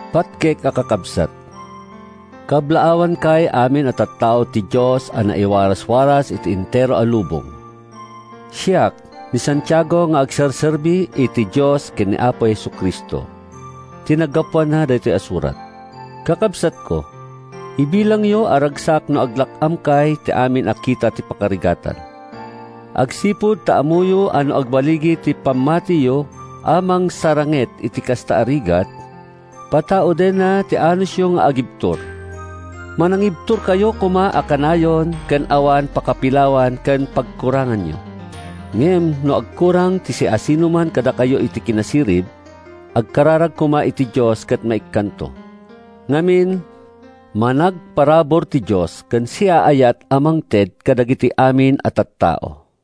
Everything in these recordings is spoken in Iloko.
Patgek a Kakabsat: Kablaawankay amin a tattao ti Dios a naiwaraswaras iti entero a lubong. Siak, ni Santiago nga agserserbi iti Dios ken ni Apo Jesu-Cristo, ti naggapuan daytoy a surat. Kakabsatko, ibilangyo a ragsak no aglak-amkay iti amin a kita ti pakarigatan agsipud ta ammoyo a no agballigi ti pammatiyo a mangsaranget iti kasta a rigat, pataudenna ti anusyo nga agibtur. Managibturkayo koma a kanayon ken awan pakapilawan ken pagkuranganyo. Ngem no agkurang ti siasinoman kadakayo iti kinasirib, agkararag koma iti Dios ket maikkanto. Ngamin, managparabur ti Dios ken siaayat a mangted kadagiti amin a tattao.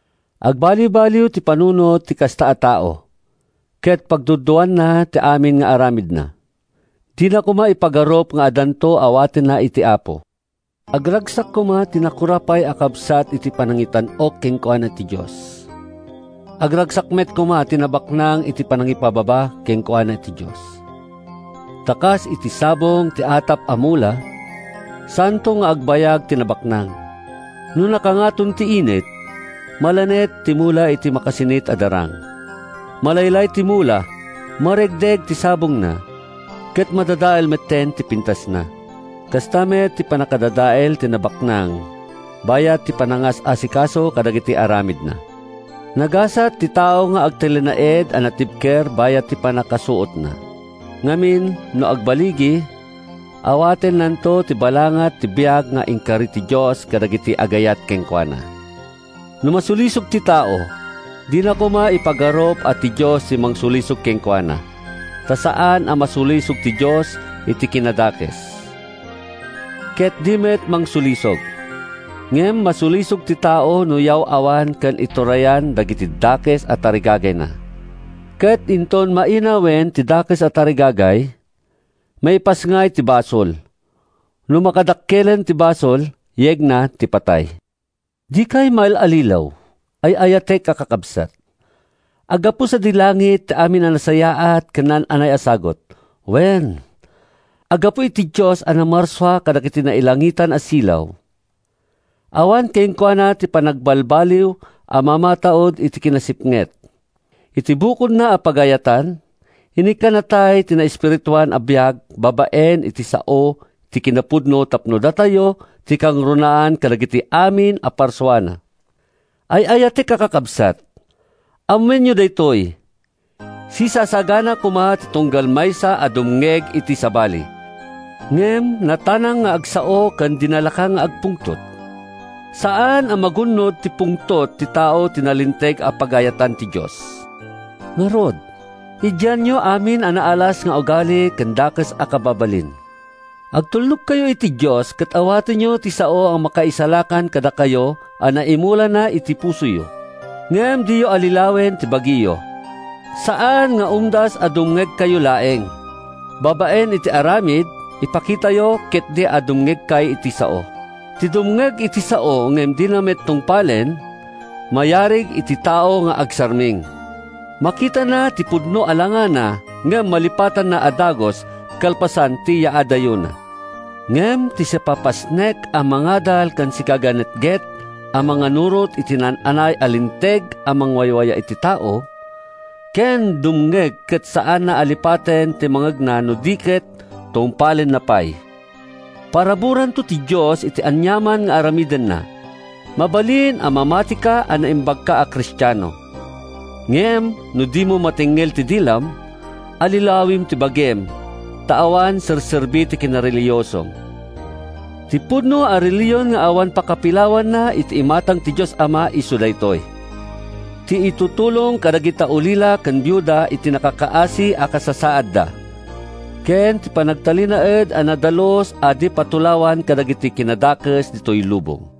Agbaliwbaliw ti panunot ti kasta a tao, ket pagduaduaanna ti amin nga aramidna. Dina koma ipagarup nga addanto awatenna iti Apo. Agragsak koma ti nakurapay a kabsat iti panangitan-ok kenkuana ti Dios. Agragsak met koma ti nabaknang iti panangipababa kenkuana ti Dios. Ta kas iti sabong ti atap a mula, saanto nga agbayag ti nabaknang. No nakangaton ti init, malanet ti mula iti makasinit a darang. Malaylay ti mula, maregreg ti sabongna, ket madadael metten ti pintasna. Kasta met ti pannakadadael ti nabaknang bayat ti panangas-asikasona kadagiti aramidna. Nagasat ti tao nga agtalinaed a natibker bayat ti pannakasuotna. Ngamin, no agballigi, awatennanto ti balangat ti biag nga inkari ti Dios kadagiti agayat kenkuana. No masulisog ti tao, dina koma ipagarup a ti Dios ti mangsulisog kenkuana. Ta saan a masulisog ti Dios iti kinadakes, ket di met mangsulisog. Ngem masulisog ti tao no yaw-awan ken iturayan dagiti dakes a tarigagayna; ket inton mainawen ti dakes a tarigagay, maipasngay ti basol. No makadakkelen ti basol, yegna ti patay. Dikay maallilaw, ay-ayatek a kakabsat. Aggapu sadi langit ti amin a nasayaat ken naan-anay a sagut. Wen, aggapu iti Dios a namarsua kadagiti nailangitan a silaw. Awan kenkuana ti panagbalbaliw a mamataud iti kinasipnget. Iti bukodna a pagayatan, inikkannatay iti naespirituan a biag babaen iti sao ti kinapudno tapno datayo ti kangrunaan kadagiti amin a parsuana. Ay-ayatek a kakabsat, ammoenyo daytoy: Sisasagana koma ti tunggal maysa a dumngeg iti sabali, ngem natanang nga agsao ken di nalaka nga agpungtot. Saan a magun-od ti pungtot ti tao ti nalinteg a pagayatan ti Dios. Ngarud, idianyo amin a naalas nga ugali ken dakes a kababalin. Agtulnogkayo iti Dios ket awatenyo ti sao a makaisalakan kadakayo a naimulana iti pusoyo. Ngem diyo allilawen ti bagiyo. Saan nga umdas a dumngegkayo laeng. Babaen iti aramid, ipakitayo ketdi a dumngegkay iti sao. Ti dumngeg iti sao ngem dina met tungpalen, mayarig iti tao nga agsarming. Makitana ti pudno a langana ngem malipatanna a dagus kalpasan ti yaadayona. Ngem ti sipapasnek a mangadal ken sigaganetget a mangannurot iti naan-anay a linteg a mangwayawaya iti tao, ken dumngeg ket saanna a lipaten ti mangngegna no di ket tungpalenna pay, paraburanto ti Dios iti aniaman nga aramidenna. Mabalin a mamatika a naimbagka a Kristiano. Ngem no dimo matengngel ti dilam, allilawem ti bagim ta awan serserbi ti kinarelihiosom. Ti pudno a relihion nga awan pakapilawanna iti imatang ti Dios Ama isu daytoy: Ti itutulong kadagiti ulila ken biuda iti nakakaasi a kasasaadda ken ti panagtalinaed a nadalus a di patulawan kadagiti kinadakes ditoy lubong.